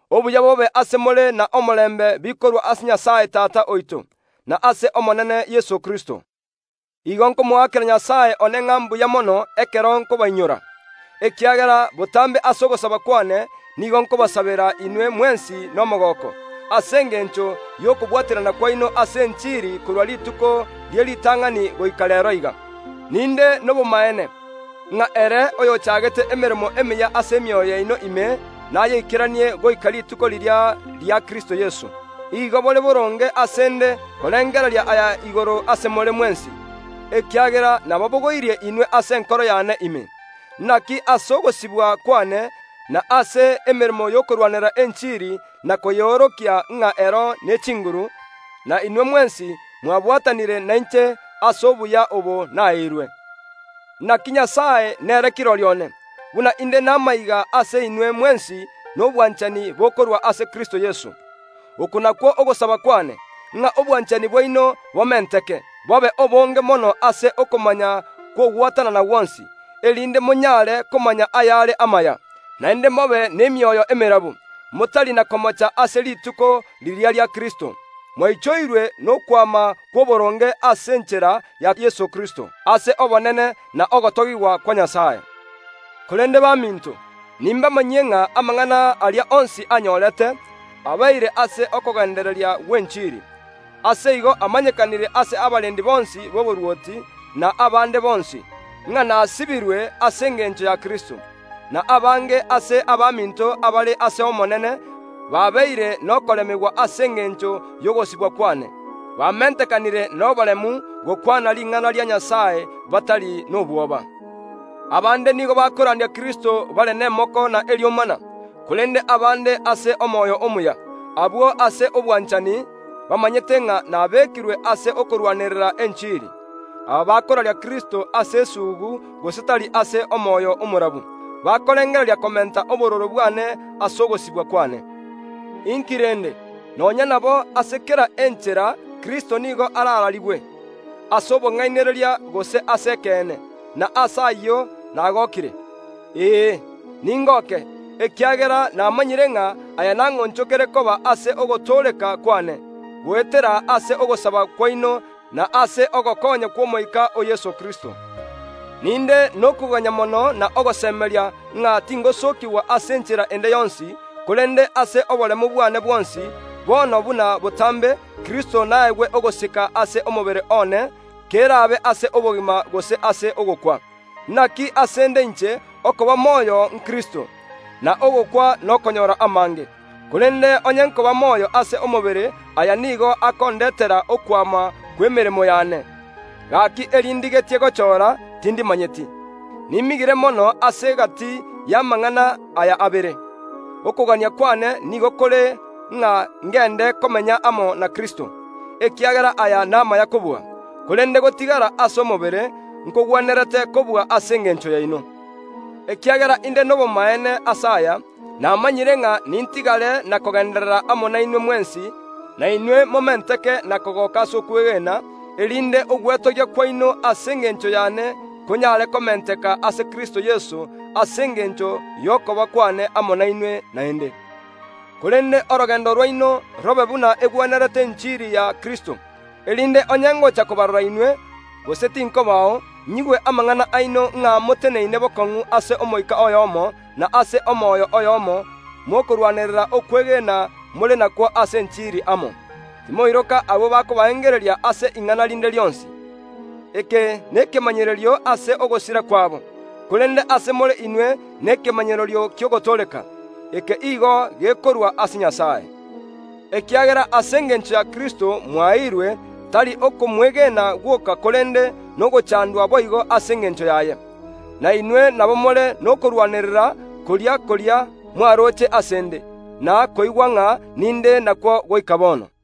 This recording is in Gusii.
Obuya bobe ase more n’omorembe bikorwa ase Nyasae Tata oito, na ase Omonene Nyasae Yeso Kristo. Igo nkomoakera Nyasae one ng’a mbuya mono chingaki chionsi nkobainyora, ekiagera botambe ase ogosaba kwane nigo nkobasabera inwe mwensi nomogooko, ase engencho y’okobwaterana kwaino ase enchiri korwa rituko rie ritang’ani goika reero iga. Ninde nobomaene, ng’a Nyasae oyochagete emeremo emiya ase emioyo yaino ime nayeikeranie goika rituko riria ria Kristo Yeso. Igo bore boronge ase ’nde korengereria aya igoro ase more mwensi, ekiagera nababogoirie inwe ase enkoro yane ime. Naki ase ogosibwa kwane na ase emeremo y’okorwanerera enchiri na koyeorokia ng’a ero nechinguru, na inwe mwensi mwabwatanire nainche ase obuya obo naeirwe. Naki Nyasae nere kirori one, buna ’nde namaiga ase more mwensi nobwanchani bokorwa ase Kristo Yeso. Oko nakwo ogosaba kwane, ng’a obwanchani bwaino bomenteke, bobe obonge mono ase okomanya kw’ogwatanana gwonsi, erinde monyare komanya ayare amaya, naende mobe n’chinkoro chindemu, motari na komocha ase rituko ria Kristo. Mwaichoirwe n’okwama kw’oboronge ase enchera ya Yeso Kristo, ase obonene na ogotogigwa kwa Nyasae. Korende baminto, nimbamanyie ng’a amang’ana aria onsi anyorete, abeire ase okogendereria gw’enchiri. Ase igo amanyekanire ase abarendi bonsi b’omorwoti, na ase abande bonsi ng’a nasibirwe ase engencho ya Kristo. Na abange ase abaminto abare ase Omonene Nyasae babeire n’okoremigwa ase engencho y’ogosibwa kwane, bamentekanire n’oboremu gokwana ring’ana ria Nyasae batari nobwoba. Abande nigo bakorandia Kristo bare n’emoko n’eriomana, korende abande ase omoyo omuya, abwo ase obwanchani, bamanyete ng’a nabekirwe ase okorwanerera enchiri. Aba bakoraria Kristo ase esuugu gose tari ase omoyo omorabu, bakorengereria komenta obororo bwane ase ogosibwa kwane. Inki rende? Nonya nabo, ase kera enchera Kristo nigo arararigwe, ase obong’ainereria gose ase ekeene, na ase ayio nagokire. Ee, ningooke, ekiagera namanyire ng’a aya nang’onchokere koba ase ogotooreka kwane, goetera ase ogosaba kwaino na ase ogokonya kw’Omoika o Yeso Kristo. Ninde nokoganyererera okonene n’ogosemeria ng’a tingosookigwa ase enchera ende yonsi, korende ase oboremu bwane bwonsi, bono buna botambe, Kristo naegwe ogosika ase omobere one, keraabe ase obogima gose ase ogokwa. Naki ase ’nde inche, okoba moyo n’Kristo, na ogokwa nokonyora amange. Korende onye nkoba moyo ase omobere, aya nigo akondetera okwama kw’emeremo yane; gaki eri ndigetie gochora, tindimanyeti. Nimigire mono ase egati y’amang’ana aya abere. Okogania kwane nigo kore ng’a ngende komenya amo na Kristo; ekiagera aya namaya kobua. Korende gotigara ase omobere nkogwenerete kobua ase engencho yaino. Ekiagera inde nobomaene ase aya, namanyire ng’a nintigare na kogenderera amo nainwe mwensi, na inwe momenteke na kogoka ase okwegena, erinde ogwetogia kwaino ase engencho yane konyare komenteka ase Kristo Yeso, ase engencho y’okoba kwane amo nainwe naende. Korende orogendo rwaino robe buna egwenerete enchiri ya Kristo, erinde onye ngocha kobarora inwe, gose tinkobao, nyigwe amang’ana aino ng’a moteneine bokong’u ase omoika oyomo, na ase omoyo oyomo mokorwanerera okwegena more nakwo ase enchiri amo. Timoiroka abwo bakobaengereria ase ing’ana rinde rionsi. Eke nekemanyererio ase ogosira kwabo, korende ase more inwe nekemanyererio ki’ogotooreka. Eke nigo gekorwa ase Nyasae. Ekiagera ase engencho ya Kristo mwaeirwe, tari okomwegena gwoka korende nogochandwa boigo ase engencho yaye. Na inwe nabo more nokorwanerera koria koria mwaroche ase ’nde, na koigwa ng’a ninde nakwo goika bono.